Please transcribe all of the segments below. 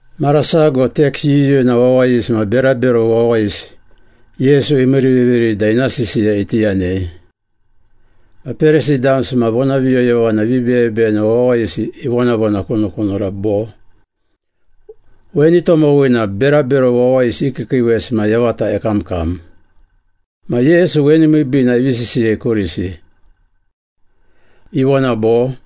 Mara sago teks yuyuna wawayisi ma berabero wawayisi Yesu imiiriviviri da ina sisiya iti yanei. Ma Perisi damsi ma vonaviyoyovana vibeyebeyena wawayisi ivonavonakunukunura bo, “Weni tomowina berabero wawayisi i kiikiiwesi ma yavata ekamkam.” Ma Yesu weni miibiina ivi sisiyei kurisi. Ivona bo,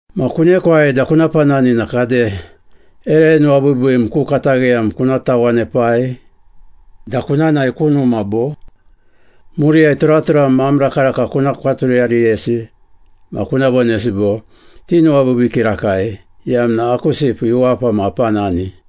Ma kunekwai da kuna panani na kade ere nuwabiibiim ku katagheyam kuna tawanepai da kuna nae ku numa bo? Muriyai turaturam ma am rakaraka kuna kwaturiyariyesi ma kuna vonesi bo, ‘Tinuwabiibii kirakai, iyamna aku sipu iwapa ma apanani.’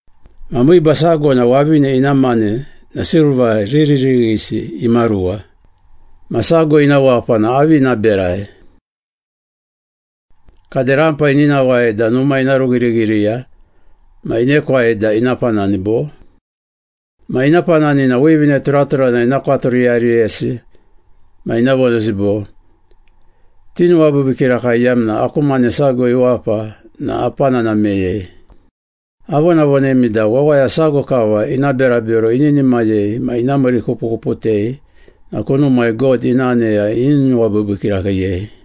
“Ma miiba sago na wavine ina mane na silva riririghisi imaruwa, ma sago ina wapa na avi ina berai? Kade rampa ini nawai da numa ina rughirighiriya ma inekwai da ina panani bo? Ma ina panani na wivine turaturana ina kwaturiyariyesi ma ina vonesi bo, ‘Tinuwabiibii kirakai iyamna aku mane sago iwapa na apanana meyei.’ Avonavonemi da wawaya sago kava ina berabero ininimayei ma ina miirikupukuputei na kunumai God ina aneya ini nuwabiibii kirakiiyei.”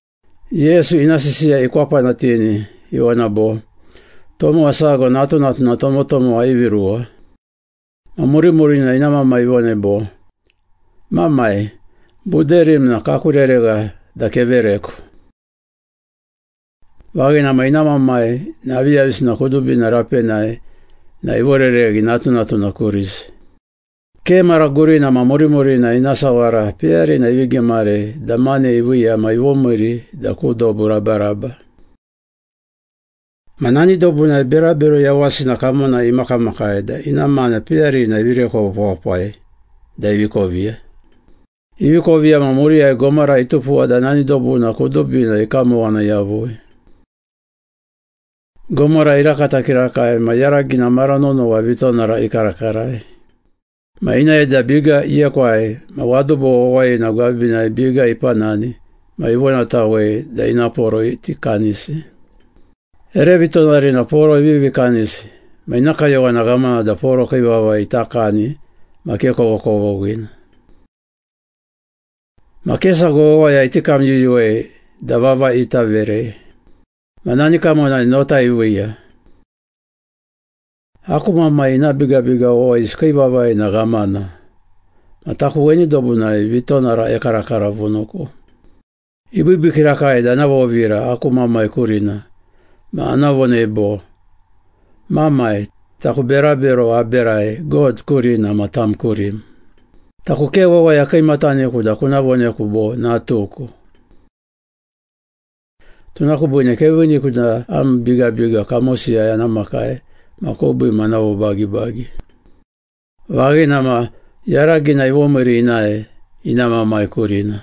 Yesu ina sisiya ikwapanatini, ivona bo, “Tomowa sago natunatuna tomotomowa ivi ruwa. Ma murimurina ina mamai ivonei bo, ‘Mamai, buderim na kaku reregha da kevereku.’ Vaghina ma i mamai na aviyavisina kudubina rapenai na ivorereghi natunatuna kurisi. Ke mara gurina ma murimurina ina sawara peyarina ivi gimarei da mane iviiya ma ivomiiri da ku dobu rabaraba. Ma nani dobunai berabero yawasina kamonai imakamakai da ina mane peyarina ivi rekwe wapawapai da ivi koviya. Ivi koviya ma muriyai gomara itupuwa da nani dobuna kudubina ikamowana yavui. Gomara irakata kirakai ma yaragina mara nonowa vitonara ikarakarai. Ma inae da biga iekwai ma wadubo wawayina gwabinai biga ipanani ma ivonatawei da ina poro iti kanisi. Ere vitonarina poro ivivi kanisi ma ina kayowana ghamana da poro kii vavai ita kani ma ke kovokovoghina. Ma ke sago wawaya iti kamyuyuwei da vavai ita verei. Ma nani kamonai nota iviiya. ‘Aku mamai ina bigabiga wawayisi kii vavai na ghamana, ma taku weni dobunai vitonara ekarakaravunuku. Ibiibii kirakai da ana vovira aku mamai kurina, ma ana vonei bo, “Mamai, taku berabero aberai God kurina ma tam kurim. Taku ke wawaya kiimataniku da kuna voneku bo, natuku. Tuna kubiine keviiniku da am bigabiga kamosiyai ana makai ma kubiim ana vobagibagi.” ’ Vaghina ma yaragina ivomiiri inae ina mamai kurina.”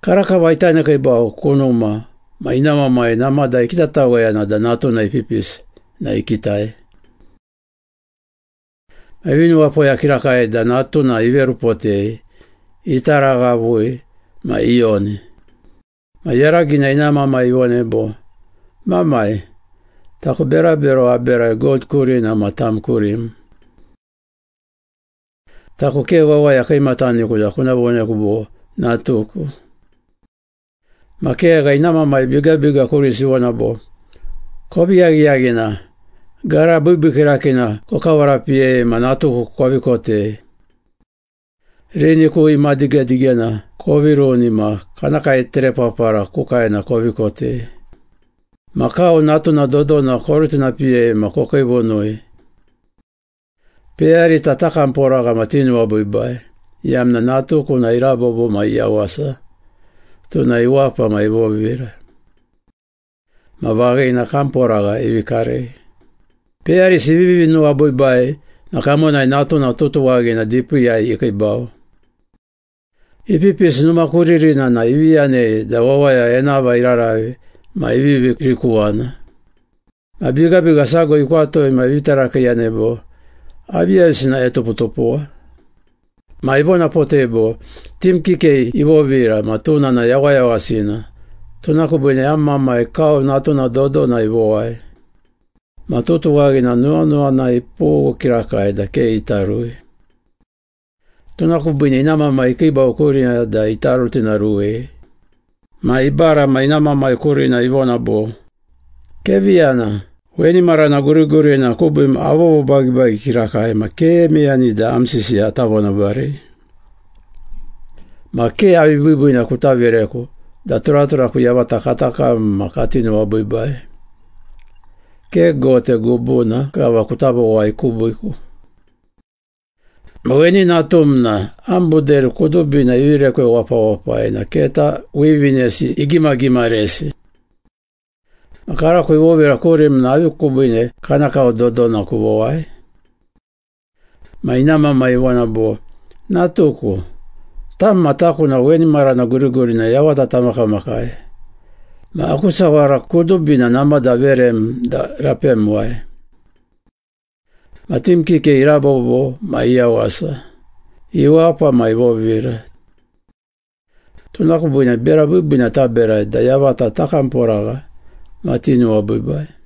“Karakava ita nekiibau ku numa ma ina mamai namada ikitataweyana da natuna ipipisi na ikitai. Ma ivi nuwapoya kirakai da natuna iverupotei, itaraghavui ma iyoni. Ma yaragina ina mamai ivonei bo, ‘Mamai, taku berabero aberai God kurina ma tam kurim. Taku ke wawaya kiimataniku da kuna voneku bo, natuku.’ Ma kegha, ina mamai bigabiga kurisi ivona bo, ‘Kovi yaghiyaghina! Gara biibii kirakiina kokavarapiyei ma natuku kovi kotei. Rini ku imadigedigena kovi runi ma kana kaeterepapara ku kaena kovi kotei. Ma kau natuna dodona korutinapiyei ma kokiivunui. Peyarita takamporagha ma tinuwabiibai, iyamna natuku na irabobo ma iyawasa, tuna iwapa ma ivovira.’ Ma vaghina, kamporagha ivi karei.” “Peyarisi ivivi nuwabiibai na kamonai natuna tutuwaghina dipiiyai ikiibau. Ipipisi numa ku ririna na ivi yanei da wawaya enava iraravi ma ivivi rikuwana. Ma bigabiga sago ikwatui ma ivi tarakiiyanei bo, ‘Aviyavisina etuputupuwa?’ Ma ivonapotei bo, ‘Tim kikei ivovira ma tuna na yawayawasina, tuna kubiine am mamai kau natuna dodona ivowai.’ Ma tutuwaghina nuwanuwana ipughu kirakai da ke ita rui. Tuna kubiine ina mamai ikiibau kurina da ita rutinaruwei. Ma ibara ma ina mamai kurina ivona bo, ‘Kevi yana, weni marana gurigurina kubiim avovobagibagi kirakai ma ke meyani da am sisiya ata vonabarei. Ma ke avi biibiina kuta vereku da turaturaku yavata kata kam ma kati nuwabiibai, ke gote gubuna kava kuta vowai kubiiku. Ma weni natum na am buderi kudubina ivi rekwe wapawapai na keta wivinesi igimagimaresi. Ma karako ivovira kurim na avi kubiine kana kau dodona kuvowai?’ Ma ina mamai ivona bo, ‘Natuku, tam ma taku na weni marana gurigurina yavata tamakamakai, ma aku sawara kudubina namada averem da rapemuwai. Ma tim kikei irabobo ma iyawasa, iwapa ma ivovira. Tuna kubiine bera biibiina taberai da yavata takamporagha ma tinuwabiibai.’”